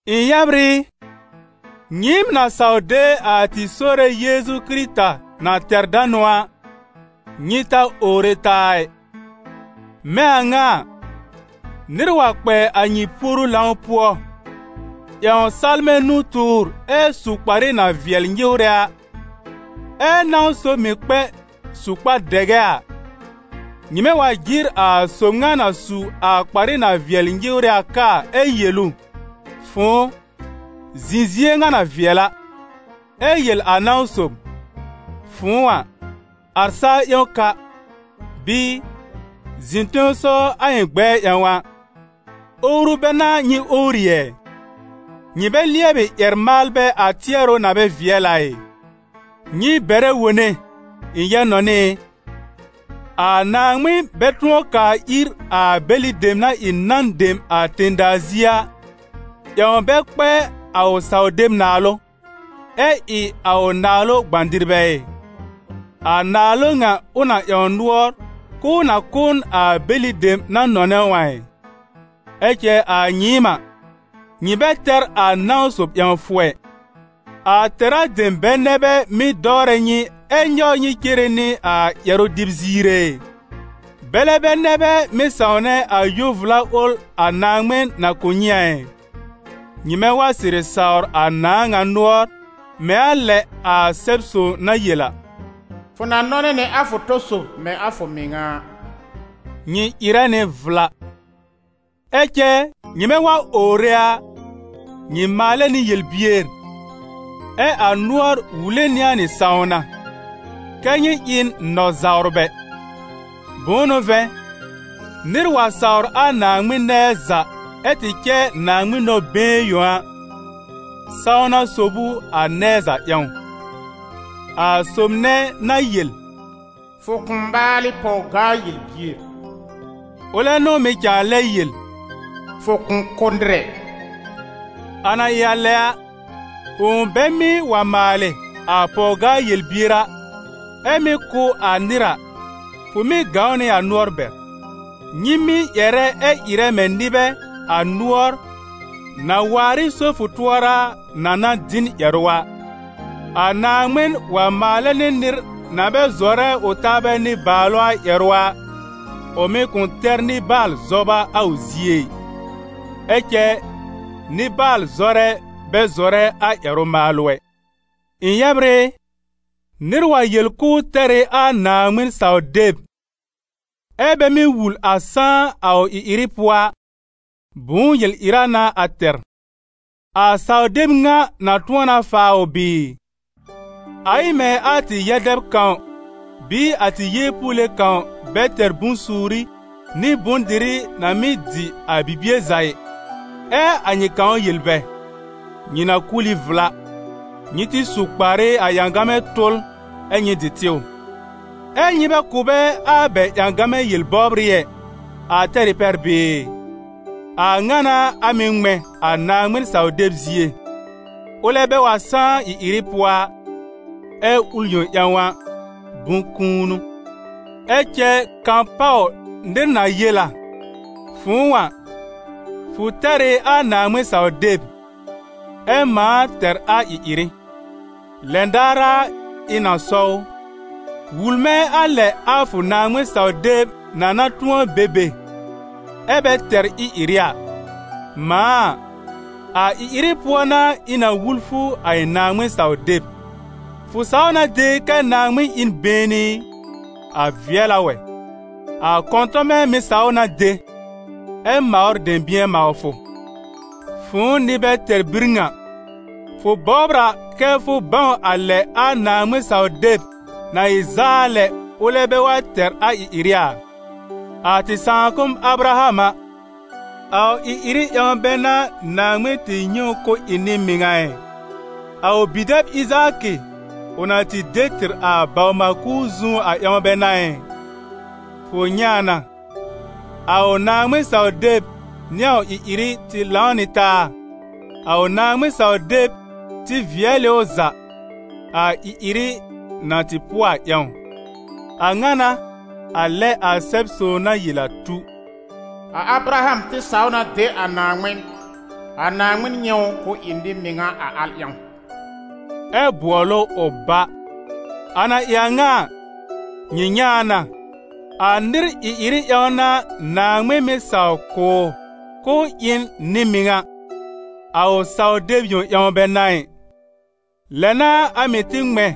Ɩ̃ yɛbr ɩ, nyɩɩm na saw de a tɩ Sore Yeezu Kɩrɩta na tɛr danʋ a, nyɩ ta owre taa ɩ. Mɛ̃ a ŋa a, nɩr wa kpɛ a nyɩ puoru lãw pʋɔ, ƴãw salmɛ̃ nu-tʋʋr ɛ su kparɩ na vɩɛl nyɩwrɛ a, ɛ́ nãw sob mɩ̀ kpɛ su kpar-dɛgɛ a, nyɩmɛ wa jɩr a sob ŋa na su a kparɩ na vɩɛl nyɩwrɛ a kaa ɛ yel ʋ: «Fʋ̃ʋ, zɩ̃ zie ŋa na vɩɛl a», ɛ yel a nãw sob: «Fʋ̃ʋ a, ar sa-ƴẽwn ka» bɩɩ «Zɩ̃ tẽsɔw a ɩ̃ gbɛɛ ƴãw» a, owru bɛ n'a nyɩ owri ɛ? Nyɩ bɛ lɩɛbɩ ƴɛr-maalbɛ a tɩɛrʋ na bɛ vɩɛl a ɩ? Nyɩ bɛrɛ wone, ɩ̃ yɛb-nɔnɩ ɩ: a Naaŋmɩn bɛ tʋ̃ɔ kaa ir a bɛlɩ dem na ɩ nan dem a tẽ-daa zie a, ƴãw bɛ kpɛ a ʋ saw-deb naalʋ, ɛ ɩ a ʋ Naalʋ gbã-dɩrbɛ ɩ? A Naalʋ ŋa ʋ na ƴãw nʋɔr k'ʋʋ na kʋ̀ n a bɛlɩ dem na nɔnɛ ʋ a ɩ? Ɛ cɛ a nyɩɩm a, nyɩ bɛ tɛr a nãw sob ƴãwfʋ ɛ. A tɛ̀rá dem bɛ nɛ bɛ mɩ́ dɔwrɛ nyɩ ɛ nyɔwr nyɩ cere nɩ a ƴɛrʋ-dɩb ziir ɛ? Bɛlɛ bɛ nɛ bɛ mɩ́ sãwnɛ a yo-vla ʋl a Naaŋmɩn na kʋ̀ nyɩ a ɩ? Nyɩmɛ wa sɩrɩ sawr a Nãàŋa nʋɔr mɛ̃ a lɛ a Sɛb-sõw na yel a: «Fʋ na nɔnɛ nɩ a fʋ tɔ sob mɛ̃ a fʋ mɩŋa a», nyɩ ɩrɛ nɩ vla. Ɛ cɛ nyɩmɛ wa owre a, nyɩ maalɛ nɩ yel-bier, ɛ́ a nʋɔr wule nɩ a nyɩ sãwna: kɛ́ nyɩ ɩ n nɔ-zawrbɛ. Bʋ̃ʋ n'ʋ vɛ̃, nɩr wa sawr a Naaŋmɩn nɛɛ za ɛ tɩ cɛ Naaŋmɩn nɔ-been yõ a, sãwna sob ʋ a nɛɛ za ƴãw. A sob nɛ na yel: «Fʋ kʋ̃ maalɩ pɔw-gaa-yel-bier» a, ʋlɛ n'ʋ mɩ̀ cãa lɛ yel: «Fʋ kʋ̃ kʋ́ nɩr ɛ.» A na ɩ lɛ a, fʋ̃ʋ bɛ mɩ́ wa maalɩ a pɔw-gaa-yel-bier a, ɛ mɩ́ kʋ́ a nɩr a, fʋ mɩ́ gãw nɩ a nʋɔr bɛr. Nyɩ mɩ́ ƴɛrɛ ɛ ɩrɛ mɛ̃ nɩbɛ, a nʋɔr, na waar ɩ so-fʋ-tʋɔra a, na na dɩ n ƴɛrʋ a. A Naaŋmɩn wa maalɛ nɩ nɩr na bɛ zɔrɛ ʋ taabɛ nɩbaalʋ a ƴɛrʋ a, ʋ mɩ̀ kʋ̃ tɛr nɩbaal-zɔba a ʋ zie ɩ; ɛ cɛ nɩbaal-zɔrɛ bɛ zɔrɛ a ƴɛrʋ-maalʋ ɛ. Ɩ̃ yɛbr ɩ, nɩr wa yel k'ʋʋ tɛr ɩ a Naaŋmɩn-saw-deb, ɛ́ bɛ mɩ́ wul a sãá a ʋ ɩ-ɩrɩ pʋɔ a, bʋ̃ʋ yel-ɩra n'a a tɛr? A saw-deb ŋa na tʋ̃ɔ na faa ʋ bɩɩ? A ɩ mɛ̃ a tɩ yɛ-dɛb kãw bɩɩ a tɩ yeepuule kãw bɛ tɛr bʋ̃-suuri nɩ bʋ̃-dɩrɩ na mɩ́ dɩ a bibie za ɩ, ɛ a nyɩ kãw yel bɛ: «Nyɩ na kul ɩ vla; nyɩ tɩ su kparɩ a ƴãgamɛ tʋl ɛ nyɩ dɩ tɩw», ɛ́ nyɩ bɛ kʋ̀ bɛ a bɛ ƴãgamɛ yel-bɔbrɩ ɛ, a tɛr ɩ pɛr bɩɩ? A ŋa n'a a mɩ̀ ŋmɛ̃ a Naaŋmɩn-saw-deb zie: ʋlɛ bɛ wa sãá ɩ-ɩrɩ pʋɔ a, ɛ ʋl yõ ƴãw a, bʋ̃-kũu n'ʋ. Ɛ cɛ kapaw nɩr na yel a: «Fʋ̃ʋ a, fʋ tɛr ɩ a Naaŋmɩn-saw-deb, ɛ mãa tɛr a ɩ-ɩrɩ.» Lɛn daar a ɩ̃ na sɔw ʋ: «Wul mɛ̃ a lɛ a fʋ Naaŋmɩn-saw-deb na na tʋ̃ɔ be be, ɛ bɛ tɛr ɩ-ɩrɩ a. Mãa a, a ɩ-ɩrɩ pʋɔ n'a ɩ̃ na wul fʋ a ɩ̃ Naaŋmɩn-saw-deb.» Fʋ saw na de kɛ́ Naaŋmɩn ɩ n been i? A vɩɛl a wɛ. A kɔ̃tɔmɛ mɩ̀ saw na de, ɛ mawr dɛ̃bɩ̃ɛ-mawfʋ. Fʋ̃ʋ nɩ-bɛ-tɛr-bir ŋa, fʋ bɔbr a kɛ́ fʋ bãw a lɛ a Naaŋmɩn-saw-deb na ɩ zaa lɛ ʋlɛ bɛ wa tɛr a ɩ-ɩrɩ a? A tɩ sãakʋm Abraham a, a ʋ ɩ-ɩrɩ ƴãw bɛ n'a Naaŋmɩn tɩ nyɛ̃ ʋ k'ʋ ɩ nɩ-mɩŋa ɩ? A ʋ bi-dɛb Ɩzaakɩ ʋ na tɩ de tɩr a baw-maal-kuur zu a ƴãw bɛ n'a ɩ? Fʋ nyɛ̃ a na, a ʋ Naaŋmɩn-saw-deb nɩ a ʋ ɩ-ɩrɩ tɩ lãw nɩ taa: a ʋ Naaŋmɩn-saw-deb tɩ vɩɛl ɩ ʋ za, a ɩ-ɩrɩ na tɩ pʋɔ a ƴãw. A ŋa n'a, a lɛ a Sɛb-sõw na yel a tu: «A Abraham tɩ saw na de a Naaŋmɩn, a Naaŋmɩn nyɛ̃ ʋ k'ʋ ɩ nɩ-mɩŋa a al ƴãw», ɛ bʋɔl ʋ ʋ bá. A na ɩ a ŋa a, nyɩ nyɛ̃ a na, a nɩr ɩ-ɩrɩ ƴãw n'a Naaŋmɩn mɩ́ saw kʋ̀ ʋ k'ʋʋ ɩ n nɩ-mɩŋa, a ʋ saw-deb yõ ƴãw bɛ n'a ɩ. Lɛ n'a a mɩ̀ tɩ ŋmɛ̃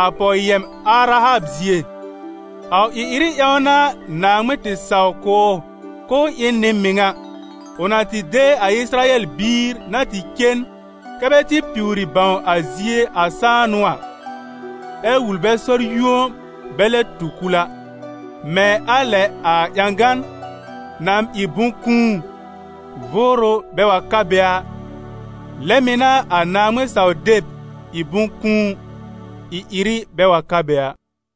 a pɔw yɛm Arahab zie. A ʋ ɩ-ɩrɩ ƴãw n'a Naaŋmɩn tɩ saw kʋ̀ ʋ k'ʋʋ ɩ n nɩ-mɩŋa, ʋ na tɩ de a Ɩsɩrayɛl biir na tɩ cen kɛ bɛ tɩ piwri bãw a zie a sãanʋ a, ɛ wul bɛ sɔr-yũo bɛ lɛb tu kul a. Mɛ̃ a lɛ a ƴãgan na ɩ bʋ̃-kũu, vʋʋrʋ bɛ wa ka be a, lɛ mɩ̀ n'a a Naaŋmɩn-saw-deb ɩ bʋ̃-kũu, ɩ-ɩrɩ bɛ wa ka be a.